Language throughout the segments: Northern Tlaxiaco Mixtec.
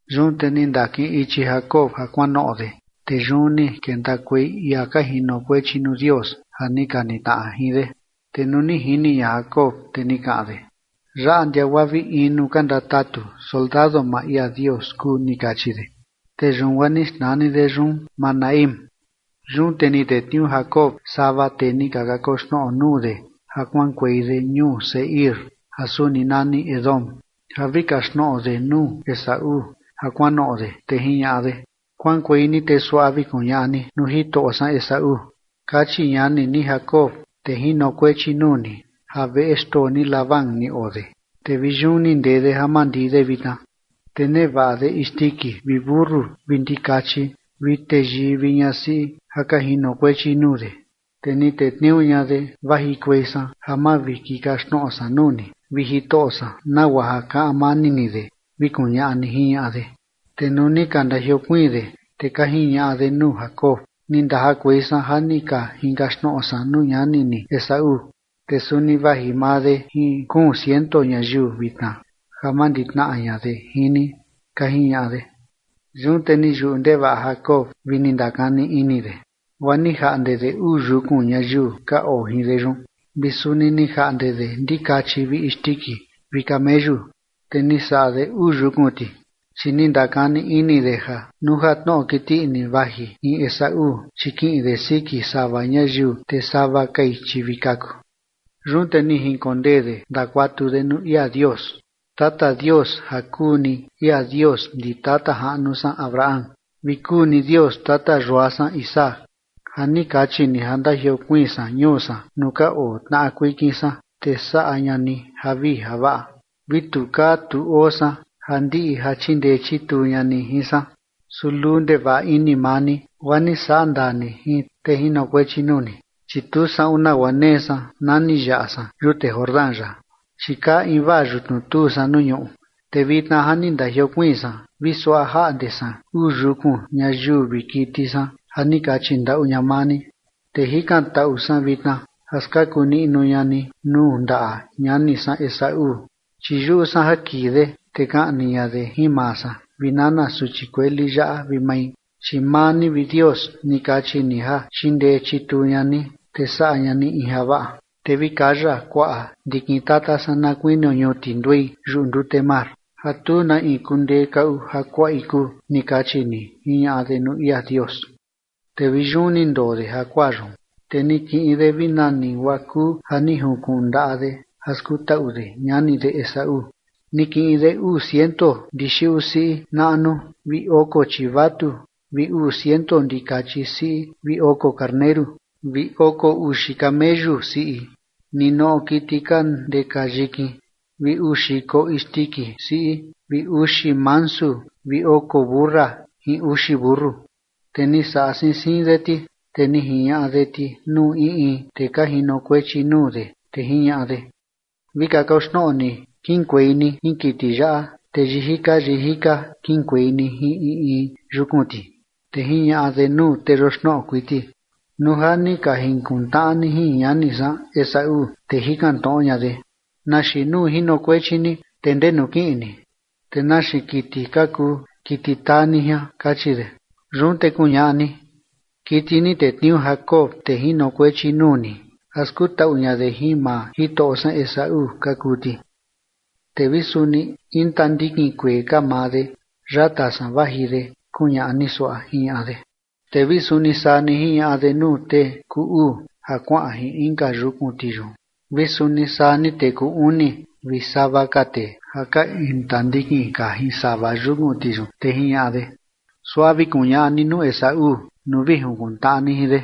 Yun te ni ndakiꞌin ichi Jacob ja kuanoꞌo de, te yun ni kentakuei ia ka jinokuechi nuu Dios ja ni ka nitnaꞌa jin de. Te nuu ni jini ña Jacob, te ni kaꞌan de: ―Yaꞌa ndia guaa vi in nuu ka ndatatu soldado maa ia Dios kuu ―ni kachi de. Te yun guaa ni xnani de yun Mahanaim. Yun te ni tetniuu Jacob sava tee ni ka kakoxnoꞌo nuu de ja kuaꞌankuei de ñuu Seir ja suni nani Edom ja vi kaxtnoꞌo de nuu Esaú ja kuanoꞌo de. Te jiñaꞌa de: ―Kuaꞌankuei ni te suaꞌa vi kuñaꞌa ni nuu jitoꞌo san Esaú: “Kachi ñani ni Jacob, tee jinokuechi nuu ni, ja veꞌe xtoo ni Labán ni oo de, te vi yun ni ndee de ja mandii de vitna. Te nevaꞌa de isndiki vi mentu vi ndikachi vi teyii vi ñasiꞌi ja ka jinokuechi nuu de, te ni tetniuu ña de vajikuei san ja mavikikaxtnoꞌo san nuu ni, vi jitoꞌo san, nagua ja kaꞌan mani ni de”, vi kuñaꞌa ni ―jiñaꞌa de. Te nuu ni ka ndajiokuiin de, te ka jiñaꞌa de nuu Jacob: ―Ni ndajakuei san ja ni ka jinkaxtnoꞌo san nuu ñani ni Esaú, te suni vaji maa de jin kuun ciento ñayiu vitna ja manditnaꞌa ña de jin ni ―ka jiñaꞌa de. Yun te ni yuꞌu ndevaꞌa Jacob vi ni ndakani ini de, guaa ni jaꞌnde de uu yukun ñayiu ka oo jin de yun, vi suni ni jaꞌnde de ndikachi vi isndiki vi kameyu, te ni saꞌa de uu yukun ti. Chi ni ndakani ini de ja nuu ja tnoꞌo kiti ini vaji jin Esaú, chi kiꞌin de siki sava ñayiu, te sava kai, chi vi kaku. Yun te ni jinkondee de ndakuatu de nuu ia Dios: ―Tata Dios ja kuu ni ia Dios ndi tata jaꞌnu san Abraham vi kuu ni Dios tata yua san Isaac ja ni kachi ni ja ndajiokuiin san ñuu san nuu ka oo tnaꞌa kuikin san, te saꞌa ña ni javii javaꞌa. Vi tu kaa tu oo san ja ndiꞌi ja chindee chituu ña ni jin san. Su luu ndevaꞌa ini maa ni, guaa ni saꞌa ndaa ni jin tee jinokuechi nuu ni, chi tu saꞌun nagua nee san na ni yaꞌa san yute Jordán yaꞌa, chi kaa invaa yutnu tuu san nuu ñuꞌu. Te vitna ja ni ndajiokuiin san vi suaꞌa jaꞌnde san uu yukun ñayiu vi kiti san ja ni kachi ndaꞌu ña maa ni. Te jikantaꞌu san vitna ja skaku niꞌnu ña ni nuu ndaꞌa ñani san Esaú, chi yuꞌu san ja kii de, te kaꞌni ña de jin maa san vi nana suchi kueli yaꞌa vi mai. Chi maa ni, vi Dios, ni kachi ni ja chindee chituu ña ni, te saꞌa ña ni in javaꞌa, te vi kaya kuaꞌa ndikin tata san na kuinio ñuti nduei yuꞌu ndute mar ja tu na in kundee kaꞌu ja kuaꞌi kuu, ni kachi ni ―jiñaꞌa de nuu ia Dios. Te vi yun ni ndoo de jakuaa yun. Te ni kiꞌin de vi nani guaa kuu ja ni junkuꞌun ndaꞌa de ja skutaꞌu de ñani de Esaú. Ni kiꞌin de uu ciento ndixiꞌu siꞌi naꞌnu vi oko chivatu vi uu ciento ndikachi siꞌi vi oko karneru, vi oko uxi kameyu siꞌi ninoꞌo kiti ka ndeka yikin vi uu xiko isndiki siꞌi vi uxi mansu vi oko mentu siꞌi jin uxi mentu. Te ni saꞌa siin siin de ti, te ni jiñaꞌa de ti nuu in in tee ka jinokuechi nuu de, te jiñaꞌa de: ―Vi kakoxnoꞌo ni kiꞌinkuei ni jin kiti yaꞌa, te yijika yijika kiꞌinkuei ni jin in in yukun ti. Te jiñaꞌa de nuu tee yoxnoꞌo kuiti: ―Nuu ja ni ka jinkuntnaꞌa ni jin ñani san Esaú, te jikan tnoꞌo ña de: “¿Na xiin nuu jinokuechi ni? ¿Te ndenu kiꞌin ni? ¿Te na xiin kiti ka kuu kiti taa ni jian?”, kachi de. Yun te kuñaꞌa ni: “Kiti ni tetniuu Jacob, tee jinokuechi nuu ni, ja skutaꞌu ña de jin maa jitoꞌo san Esaú ka kuu ti. Te vi suni intandikin kuee ka maa de yata san vaji de”, kuñaꞌa ni suaꞌa ―jiñaꞌa de. Te vi suni saa ni jiñaꞌa de nuu tee kuu uu ja kuaꞌan jin inka yukun ti yun vi suni saa ni tee kuu uni vi sava ka tee ja ka intandikin ka jin sava yukun ti yun, te jiñaꞌa de: ―Suaꞌa vi kuñaꞌa ni nuu Esaú nuu vi jinkuntnaꞌa ni jin de.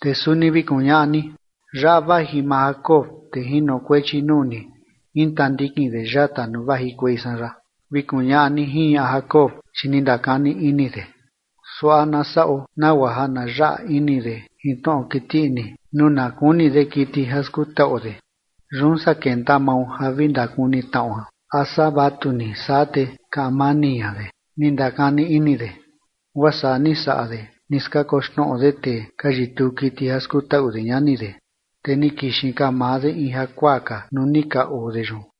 Te suni vi kuñaꞌa ni: “Yaꞌa vaji maa Jacob, tee jinokuechi nuu ni, intandikin de yata nuu vajikuei san yaꞌa”, vi kuñaꞌa ni ―jiñaꞌa Jacob, chi ni ndakani ini de: “Suaꞌa na saꞌo nagua ja na yaꞌa ini de jin tnoꞌo kiti ini nuu na kuni de kiti ja skutaꞌuo de, yun saa kenta mao ja vi ndakuni tnaꞌo a saa vatu ni saa, te kaꞌan mani ña de”, ni ndakani ini de. Guaa saa ni saꞌa de. Ni skakoxnoꞌo de tee ka yituu kiti ja skutaꞌu de ñani de. Te ni kixin ka maa de in jakuaa ka nuu ni ka oo de yun.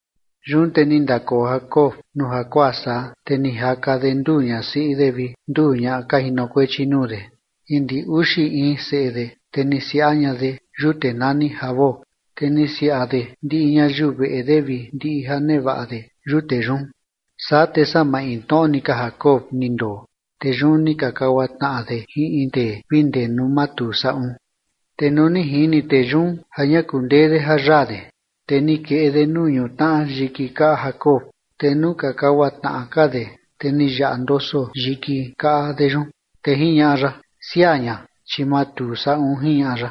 Yun te ni ndakoo Jacob nuu jakuaa saa, te ni jaka de nduu ñasiꞌi de vi nduu ñaꞌa ka jinokuechi nuu de jin ndi uxi in seꞌe de, te ni siaꞌa ña de yute nani Jaboc. Te ni siaꞌa de ndiꞌi ñayiu veꞌe de vi ndiꞌi ja nevaꞌa de yute yun. Saa te saa maintnoꞌo ni ka Jacob ni ndoo, te yun ni ka kagua tnaꞌa de jin in tee vi ndee nuu matuu saꞌun. Te nuu ni jini tee yun ja ña kundee de ja yaa de, te ni keꞌe de nuu ñutnaꞌa yiki kaꞌa Jacob, te nuu ka kagua tnaꞌa ka de, te ni yaꞌa ndoso yiki kaꞌa de yun. Te jiñaꞌa ya: ―Siaa ña, chi matuu saꞌun ―jiñaꞌa ya.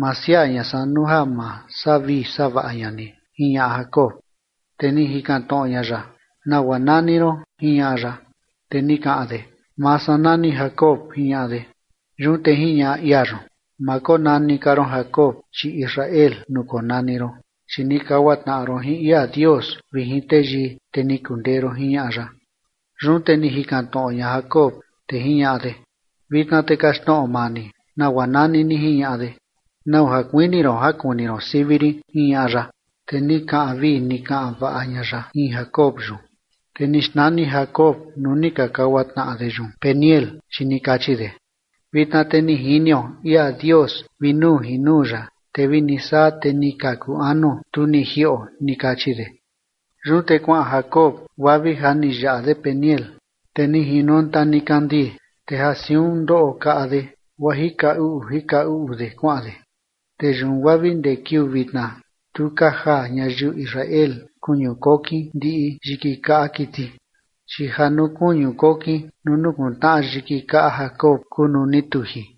―Ma siaa ña san nuu ja ma saꞌa vii saꞌa vaꞌa ña ni ―jiñaꞌa Jacob. Te ni jikan tnoꞌo ña ya: ―¿Nagua nani ron? ―jiñaꞌa ya. Te ni kaꞌan de: ―Maa san nani Jacob ―jiñaꞌa de. Yun te jiñaꞌa ia yun: ―Ma konani ka ron Jacob, chi Israel nuu konani ron, chi ni kagua tnaꞌa ron jin ia Dios vi jin teyii, te ni kundee ron ―jiñaꞌa ya. Yun te ni jikan tnoꞌo ña Jacob, te jiñaꞌa de: ―Vitna te kaxtnoꞌo maa ni nagua nani ni ―jiñaꞌa de. ―¿Nau ja kuini ron ja kuni ron sivi rin? ―jiñaꞌa ya. Te ni kaꞌan vii ni kaꞌan vaꞌa ña ya jin Jacob yun. Te ni xnani Jacob nuu ni ka kagua tnaꞌa de yun Peniel, chi ni kachi de: ―Vitna te ni jinio ia Dios vi nuu jin nuu ya, te vi ni saa te ni kaku anuo, tu ni jiꞌo ―ni kachi de. Yun te kuaꞌan Jacob guaa vi ja ni yaꞌa de Peniel, te ni jinonta nikandii, te ja siun ndoꞌo kaꞌa de guaa jika uꞌu jika uꞌu de kuaꞌan de. Te yun guaa vi ndee kiuu vitna tu ka jaa ñayiu Israel kuñu kokin ndiꞌi yiki kaꞌa kiti, chi ja nuu kuñu kokin nuu nukuntnaꞌa yiki kaꞌa Jacob kuu nuu ni tuji.